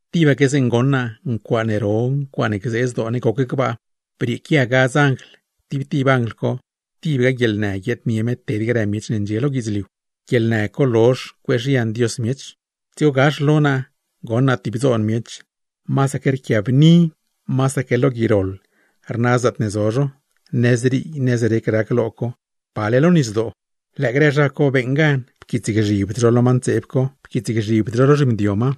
Tibaque zeeṉe goṉ naa, ncuaaṉe ro, ncuaaṉe gzee zdoo ne goc gbaa. Brieequia gadz anjl, tib tib anjl co tibga guieḻnë guiaadnie me ted grë miech ne ndxie lo guidzliu; guieḻnë co lozh cueezhian Dios miech. Dzigo gax lo naa goṉ naa tib dzoon miech, masaque rquiabni, masaque rna gui zaatne zo zho, nëzrii nëzrec rac lo co, pale lo nisdoo. Lëë grë zha co beeṉ gan, pquiitsgzhibd zho lo ma ntseeb co, pquiitsgzhibd zho lo zhimdio ma,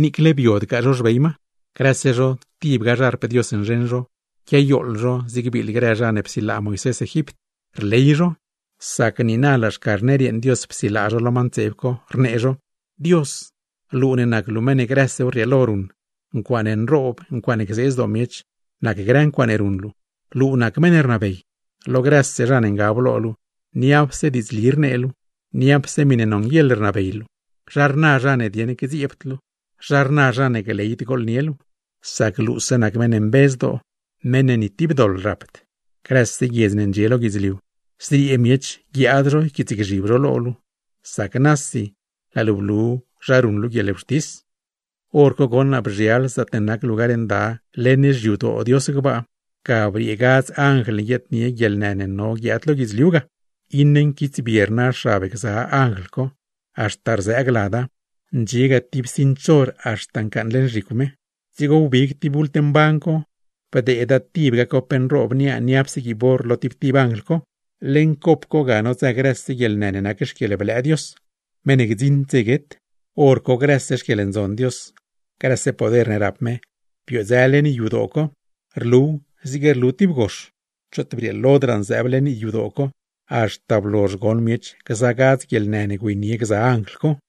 niicle biodgaa zho xbey ma. Grëse zho tibga xarp Dios nzheṉ zho, quiayooḻ zho zig biiḻ grë zha ne psilaa Moisés Egipt. Rley zho, sac niina laa Xcarner yeeṉ Dios psilaa zho lo ma ntseeb co; rnee zho: Dios, luu ne nac luu meṉ ne grësew rrieelo ruṉ, ncuaaṉe nroob, ncuaaṉe gzee zdoo miech, nac grë ncuaaṉe ruṉ luu. Luu nac meṉ ne rnabey, lo grëse zha ne ngab lo luu, niapse diidzli rnee luu, niapse miṉe nonguieḻ rnabey luu. ¿Zha rna zha ne dieṉ gdzieebd luu? ¿Zha rna zha ne gleyd gooḻnie luu? Sac luuse nac meṉ mbe zdoo, meṉ ne ni tib doḻ rapd. Grëse guiedz ne ndxie lo guidzliu, zriee miech guiaad zho yquiitsgzhib zho lo luu; sac nasi laa luu blu zha ruṉ luu guieḻwxtis. Horco goṉ naa bzhial zaatne nac Lugar Nda leṉ xyadoo Dios gbaa, ga briee gza gadz anjl ne guiaadnie guieḻnë ne no guiaad lo guidzliu ga. Iṉe nquitsbie rna xab gza anjl co, haxta rzëëg lada, ndxiega tib cinch or haxta ncaaṉ leṉ zhicw me. Dzigo wbig tib bult mban co, bdeeda tibga cop nroob niaa niapse guiib or lo tib tib anjl co; leṉ cop co ga nodzë grëse guieḻnë ne nac xquieḻblëë Dios, meṉ ne gdziṉd dze guet. Horco grëse xquieḻndzon Dios, grëse poder ne rap me, biodzë leṉ yadoo co, rluw zig rlu tib gox; choot brieelodraa nzëëb leṉ yadoo co, haxta blozh goṉ miech gza gadz guieḻnë ne güeynie gza anjl co.